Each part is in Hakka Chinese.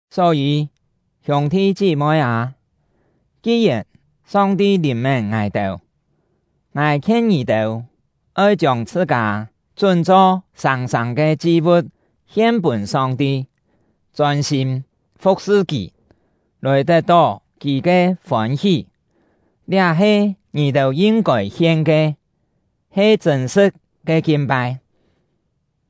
Só-yî, hiûng-thi chí-moi â, ki-yèn Song-ti lìn-mén ngài-têu, ngài khien ngì-têu oi chiông chhṳ-kâ chún-cho sâng-sâng ke chi-vu̍t hien pûn Song-ti, chôn-sîm fu̍k-sṳ Kì, lòi tet-tó Kì ke fôn-hí. Liá he ngì-têu yin-kôi hien ke, he chṳ̂n-sṳ̍t ke kin-pai.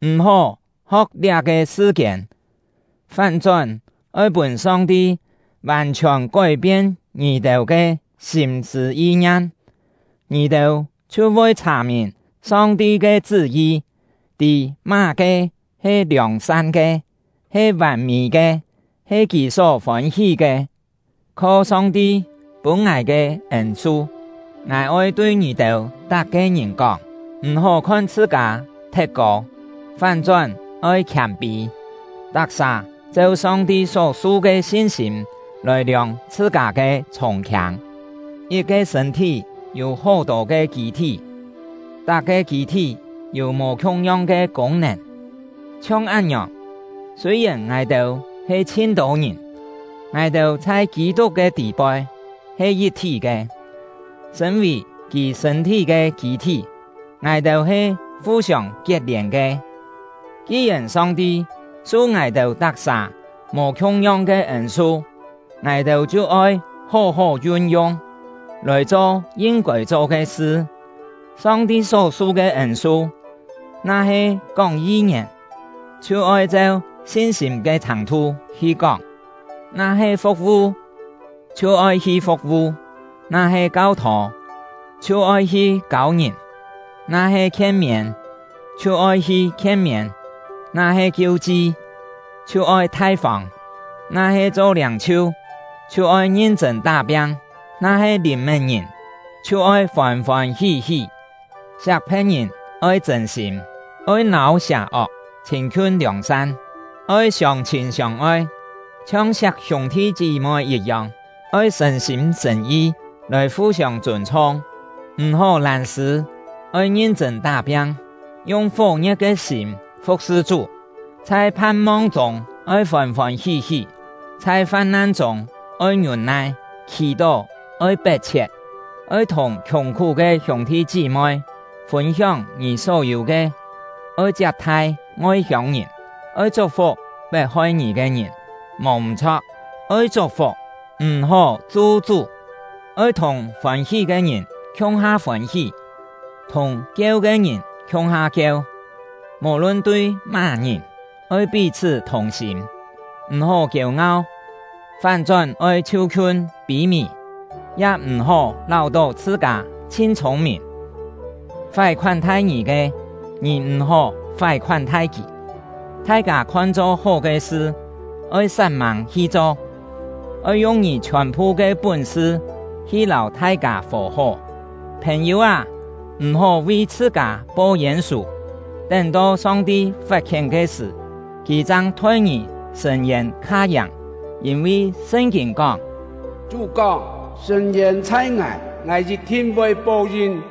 M̀-hó ho̍k liá-ke sṳ-kiên, fán-chón oi pûn Song-ti vàn-chhiòn kói-pien ngì-têu ke sîm-sṳ̂ yi-ngiam, ngì-têu chhiu voi chhà-mìn Song-ti ke chṳ́-yi, tî má-ke he liòng-san ke, he vàn-mî ke, he Kì só fôn-hí ke. Kho Song-ti pûn ngài ke ên-su, ngài oi tui ngì-têu tak-ke ngìn kóng: M̀-hó khon chhṳ-kâ thet kô, fán-chón oi khiâm-pî, tak-sà cheu Song-ti só-su ke sin-sîm lòi liòng chhṳ-kâ ke chhûng-khiâng. Yit-ke sṳ̂n-thí yû hó-tô ke kî-thí, tak-ke kî-thí yû mò khiung-yong ke kûng-nèn. Chhiong án-ngiòng, sûi-yèn ngài-têu he chhin-tô ngìn, ngài-têu chhai Kî-tuk ke tî-poi he yit-thí ke; sṳ̂n-vì kì sṳ̂n-thí ke kî-thí, ngài-têu he fu-siông kiet-lièn ke. Ki-yèn Song-ti su ngài-têu tak-sà mò khiung-yong ke ên-su, ngài-têu chhiu oi hó-hó yun-yung, lòi cho yin-kôi cho ke sṳ. Song-ti só-su ke ên-su, na-he kóng yi-ngièn, chhiu oi cheu sin-sîm ke chhàng-thu hi kóng; na-he fu̍k-vu, chhiu oi hi fu̍k-vu; na-he kau-thô, chhiu oi hi kâu ngìn; na-he khien-miên, chhiu oi hi khien-miên; na-he kiu-chi, chhiu oi thai-fông; na-he cho liâng-chhiu, chhiu oi ngin-chṳ̂n tá-piang; na-he lìn-mén ngìn, chhiu oi fôn-fôn hí-hí. Siak phe̍t-ngìn oi chṳ̂n-sîm. Oi nâu sià-ok, chhîn-khiun liòng-san. Oi siông-chhîn siông-oi, chhiong siak hiûng-thi chí-moi yit-yong; oi sṳ̀n-sîm sṳ̀n-yi lòi fu-siông chûn-chhung. M̀-hó lân-sṳ̂, oi ngin-chṳ̂n tá-piang, yung fó-ngie̍t ke sîm fu̍k-sṳ Chú. Chhai phan-mong chûng oi fôn-fôn hí-hí; chhai fam-nan chûng oi ngiûn-nai; khì-tó oi pet-chhiet. Oi thùng khiùng-khú ke hiûng-thi chí-moi fûn-hióng ngì só yû ke; oi chiap-thai ngoi-hiông-ngìn. Oi chuk-fuk pet-hoi ngì ke ngìn; mò m̀-chho̍k, oi chuk-fuk, m̀-hó chu-chú. Oi thùng fôn-hí ke ngìn khiung-ha fôn-hí, thùng kieu ke ngìn khiung-ha kieu. Mò-lun tui má-ngìn, oi pí-chhṳ́ thùng-sîm. M̀-hó kiêu-ngau, fán-chón oi chhiu-khiun pî-mì; ya m̀-hó láu-tó chhṳ-kâ chhin chhûng-mìn. Fái khoán-thai ngì ke, ngì m̀-hó fái khoán-thai kì; thai-kâ khon-cho hó ke sṳ, oi sat-mâng hi cho. Oi yung ngì chhiòn-phu ke pún-sṳ hi lâu thai-kâ fò-hó. Phèn-yû â, m̀-hó vi chhṳ-kâ po yên-sù, tén-to Song-ti fat-khién ke sṳ̀, Kì chang thoi ngì sṳ̂n-yên kha yàng, yîn-vi Sṳn-kîn kóng: “Chú kóng: Sṳ̂n-yên chhai Ngài; Ngài yit-thin voi po-yin.”